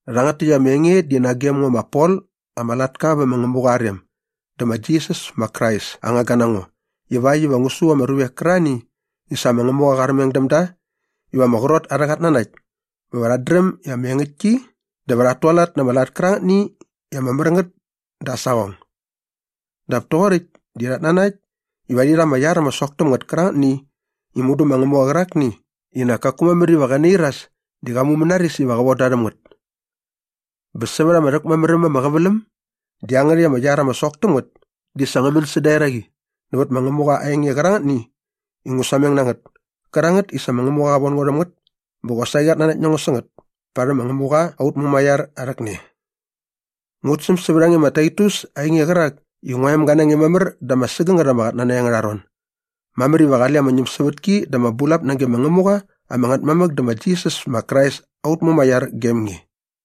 Rhangät täkt ama enge di nagem ngo ma Pol ama latka vä ma Ngämuqa aa rem dä ma Jisas ma Krais aa ngangga na ngo ivakt iva ngu su ama ruvek kärarhani i sa ma Ngämuqa qa armeng däm da iva ama qrot arhä qatnanakt bä va rhat dräm ama engäktki dä va rhat tualat na ama lat kärangätni i ama mär ngät dä aa saqong. Dap toqoräkt di rhat nanakt iva rhi rha ama iar ama sok täm ngät kärangätni i mudu ma Ngämuqa qärakni i nak kaku mamär iva qä nairas di qa mumänaris iva qä von da rhäm ngät. Bä sa vät ama rhäkmamär äm ama qäväläm dä iangärhäkt ama iar ama sok täm ngät di sa ngä män säda eraqi nävät ma Ngämuqa aa enge qärangätni i ngu sameng na ngät kärangät i sa ma Ngämuqa qa von ngo rhäm ngät bä qosaqi qat nanakt na ngo sä ngät parhäm ma Ngämuqa aut Mumaiar aa rhäkne. Ngut säm sävät a nge ma Taitus ainge qärak i ngua emga na nge mamär da ama sägängät ama qatnanakt angärha ron. Mamär iva qale ama ñämsävätki dä ama bulap nage ma Ngämuqa ama Ngätmamäk dä ma Jisas ma Krais aut Mumaiar gem nge.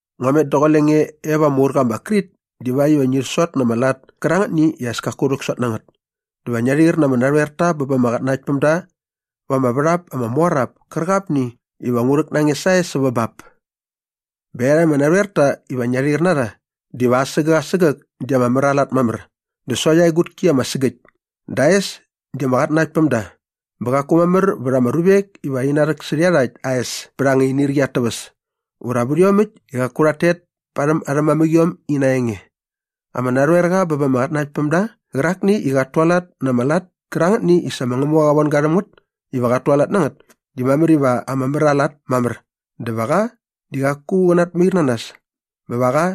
Ngua met daqule nge e va ama urqa ma Krit divakt iva ngi sot na ama lat kärangätni i as kaku rhäksot na ngät dä va ngia rhair na ama narhoerta bä ba ama qatnanaktpämda va ama värhap ama mor ap kärqapni iva ngu rhäk na nge sae sävä bap. Bä iarhakt ama narhoerta iva ngia rhair na rha diva asägäk asägäk di ama mär aa lat mamär dä sokt aa egutki ama sägäkt dä aa es di ama qatnanaktpämda bä qaku mamär vät ama ruvek iva rhi narhäksärhä iarhakt aa es pät anga inirqi at täväs ura vät iomäkt i qaku rhat tet parhäm arhä mamäqiom ina enge. Ama narhoerqa bä ba ama qatnanaktpämda qärakni i qat tualat na ama lat kärangätni i sa ma Ngämuqa qa von ga rhäm ngät iva qat tualat na ngät di mamär iva ama mär aa lat mamär bä va qa di qaku qä natmair na nas bä va qa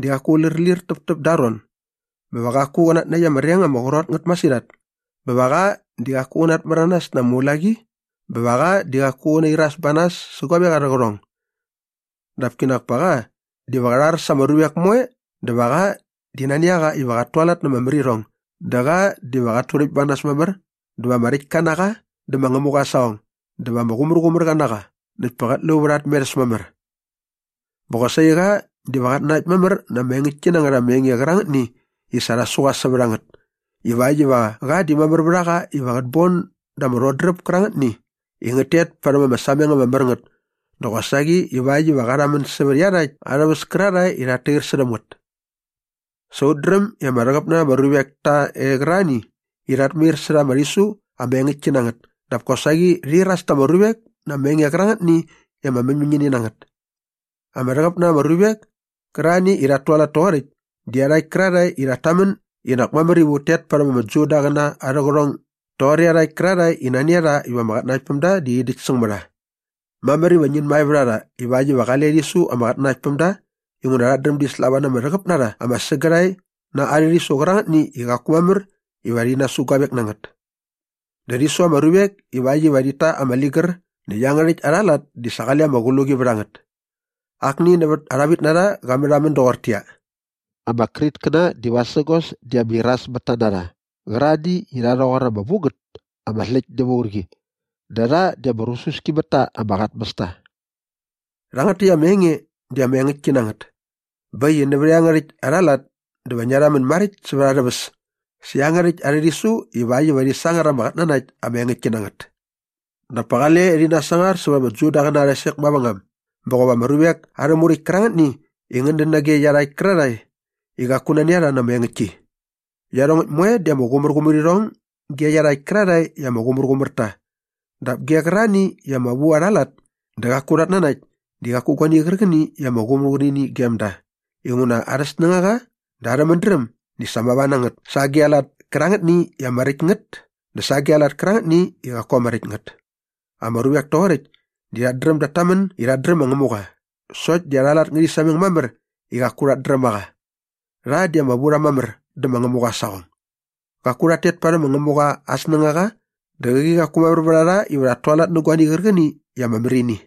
di qaku lärlir täptäp da aa ron bä va qaku qä natnäkt ama reng ama qrot ngät masirhat bä va qa di qaku qä natmäranas na ama ulaqi bä va qa di qaku qä nairas ba nas sä guavek arhä qärhong. Dap kinak pa qa diva qä rhar sa ama ruvek moe dä va qa di nani a qa iva qat tualat na ama märirhong dä qa diva qat turäkt ba nas mamär dä va ama räktka na qa dä ma Ngämuqa aa saqong dä va ama qumärqumärqa na qa näkt pa qät lu vät aa tmerhäs mamär. Bä qosaqi qa diva qat nanakt mamär na ama engäktki na ngät ama enge qärangätni i sa rha su qa sävät a ngät ivakt iva qa di mamär vät a qa iva qät bon da ama rhodräp kärangätni i ngät tet parhäm ama sameng ama mär ngät dä qosaqi ivakt iva qa rhamän sävät iarhakt arhä väs kärarhae i rhat tair särhäm ngät. Sa ut dräm i ama rhäqäp na rha ama ruvek ta e qärarhani i rhat mair särha ama rhisu ama engäktki na ngät dap kosaqi rhi iras ta ama ruvek na ama enge qärangätni i ama mäñmäñini na ngät. Ama rhäqäp na rha ama ruvek kärarhani i rhat tualat toqoräkt di iarhakt kärarhae i rhat tamän i nak mamär iva ut tet parhäm ama Judaqäna arhä qärhong doqor iarhakt kärarhae i nani a rha iva ama qatnanaktpämda di rhi däkt säng mä rha. Mamär iva ngin mae vät a rha ivakt iva qale rhi su ama qatnanaktpämda inguna rhat dräm di slava na ama rhäqäp na rha ama sägärhae na arhä rhisu qärangätni i qaku mamär iva rhi nasu guavek na ngät. Dä rhi su ama ruvek ivakt iva rhit ta ama ligär näkt iangärhäkt arha lat di sa qale ama qluqi vät a ngät. Akni nävät arha vämginarha qa märhamän doqortäqyia, “Ama Kritkäna di vasägos di ama irasmätta na rha qärarhani i rha rhoqor ama vu ngät ama släkt näva urqi. Dä rha di ama rususki mät ta ama qatmästa.” Rhangät täkt ama enge di ama engäktki na ngät. Bä äkt i nävät iangärhäkt arha lat dä va ngia rhamän maräkt sävät arhä väs sä iangärhäkt arhä rhisu ivakt iva rhi sangar ama qatnanakt ama engäktki na ngät dap pa qale rhi nasangar sävät ama Judaqäna arha sek mavängam bä qop ama ruvek arhä muräkt kärangätni i ngät dän nage iarhakt kärarhae i qaku nani a rha na ama engäktki. Iarhongäkt moe di ama qumärqumär irhong ge iarhakt kärarhae i ama qumärqumär ta dap ge qärarhani i ama vu arha lat dä qaku rhat nanakt di qaku guani qärqäni i ama qumärqumär ini gem da inguna arhä snängaqa dä arhä mädräm di sa mava na ngät sa agi a lat kärangätni i ama räkt ngät dä sa agi a lat kärangätni i qaku ama räkt ngät. Ama ruvek toqoräkt di rhat dräm dat tamän i rhat dräm ma Ngämuqa sokt di arha lat ngärhi sameng mamär i qaku rhat dräm a qa. Rha di ama vu rha mamär dä ma Ngämuqa aa saqong. Qaku rhat tet parhäm ma Ngämuqa aa snängaqa dä qäqi qaku mamär vät a rha iva rhat tualat nä guani qärqäni i ama mär ini.